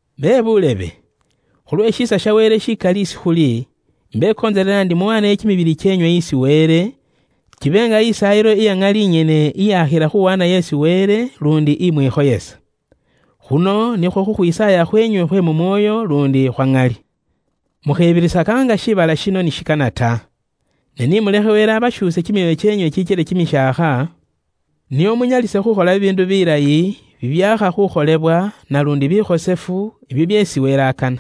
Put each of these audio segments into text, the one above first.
Bebuulebe, khulwe shiisa sha Wele shikali isi ifwe khuli, imbekontselela ndi muwaaneyo kimibili kyeenywe isi Wele, kibe nga isaayilo iya ŋali inyene, naluundi ikhosefu iyakhila khuwaanayo isi Wele luundi imwikhoyesa. Khuno nikhwo khukhwisaaya khwenywe khwe mu mwoyo luundi khwa ŋali. Mukhebirisaka nga shiibala shino ni shikana ta. Ne ni mulekhe Wele abashuuse kimyoyo kyeenywe kikyele kimishaakha, nio munyalise khukhola bibiindu bilayi, bibyaakha khukholebwa, naluundi bikhosefu, ibyo byeesi Wele akana.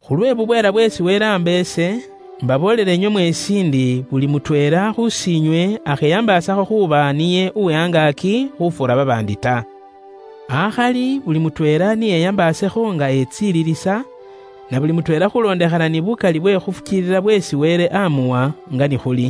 Khulwe bubweela bweesi Wele aamba ise, imbaboolela inywe mweesi ndi buli mutweela khus'inywe akheyambaasakho khuuba niye uwe angaaki khufuura babaandi ta. Akhali buli mutweela ni eyambaasekho nga etsililisa, na buli mutweela khulondekhana ni bukali bwe khufukiilila bweesi Wele amuwa, nga ni khuli.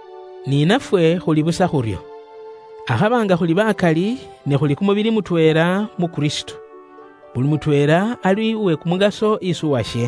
Ni nafwe khuli busa khuryo. Akhaba nga khuli bakali, ne khuli kumubili mutweela mu Kristo. Buli mutweela ali uwe kumukaso isi uwashe.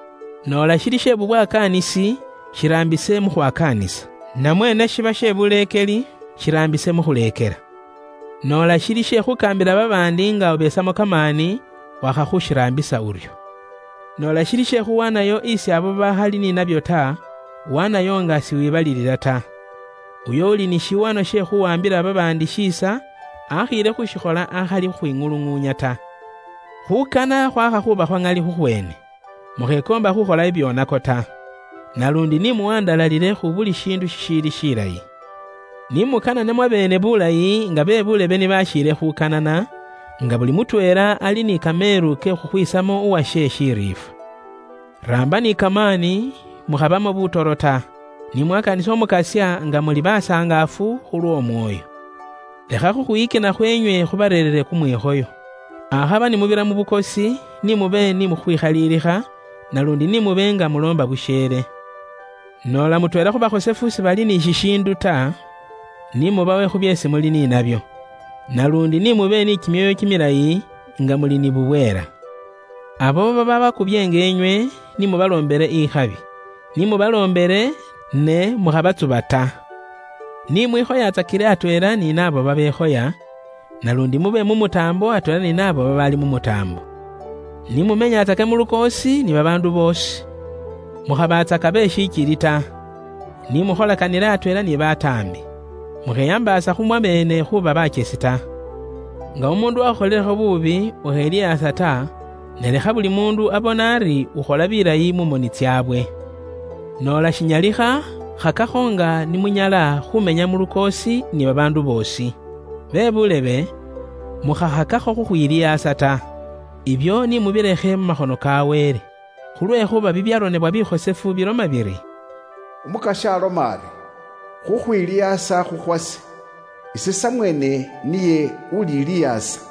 Noola shiili she bubwakaanisi, shiraambise mu khwakaanisa; namwe ne shiba she buleekeli, shiraambise mu khuleekela. Noola shili she khukaambila babaandi nga ubesamo kamaani, wakha khushiraambisa uryo. Noola shili she khuwaanayo isi abo babaakhali ni nabyo ta, waanayo nga siwibalilila ta. Uyo uuli ni shiwaanwa she khuwaambila babaandi shiisa, akhiile khuushikhola akhali khukhwiŋuluŋuunya ta. Khuukana khwaakha khuuba khwa ŋali khukhweene. Mukhekoomba khuukhola bibyoonako ta. Naluundi ni muwandalalile khu buli shiindu shishiili shilayi. Ni mukanane mwabeene bulayi nga be buulebe ni bashiile khukanana, nga buli mutweela ali ni kameelu ke khukhwisamo uwashe shiriifwa. Raamba ni kamaani; mukhabamo butoro ta. Ni mwakaanise Umukasya nga muli basangaafu, khulw'Omwoyo. Lekha khukhwiyikina khweenywe khubareerere kumwikhoyo. Akhaba ni mubira mu bukosi, ni mube ni khukhwikhalilikha, naluundi ni mube nga muloomba busheele. Noola mutweela khu bakhosefu sibali ni shishiindu ta, ni mubawe khu byeesi muli ni nabyo, naluundi ni mube ni kimyoyo kimilayi, nga muli ni bubweela. Abo babaabakubyeenga inywe, ni mu baloombele ikhabi; ni mubaloombele, ne mukhabatsuba ta. Ni mwikhoyaatsakile atweela ni naabo babekhoya, naluundi mube mumutaambo atweela ni naabo babaali mu mutaambo. Ni mumenyatsake mu lukoosi ni babaandu boosi. Mukhabatsaka be shikili ta. Ni mukholakanile atweela ni bataambi. Mukheyambaasa khu mwabeene khuuba bakyesi ta. Nga umuundu wakhukholilekho buubi, ukhelihaasa ta, ne lekha buli muundu abone ari ukhola bilayi mu moni tsaabwe. Noola shinyalikha, khakakho nga ni munyala, khuumenya mu lukoosi ni babaandu boosi. Bakanwa baase, mukhakhakakho khukhwilihaasa ta. Ibyo ni mubilekhe mu makhono ka Wele. Khulwekhuuba bibyaronebwa bikhosefu biloma biri, “Umukasya aloma ari, khukhwilihaasa khuli khukhwase. Ise samweene niye ulilihaasa.”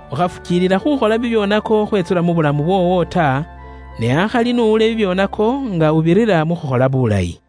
Ukhafukiilila khukhola bibyoonako khwetsula mu bulamu bwoowo ta, ne akhali n'uwule bibyoonako nga ubirira mu khukhola bulayi.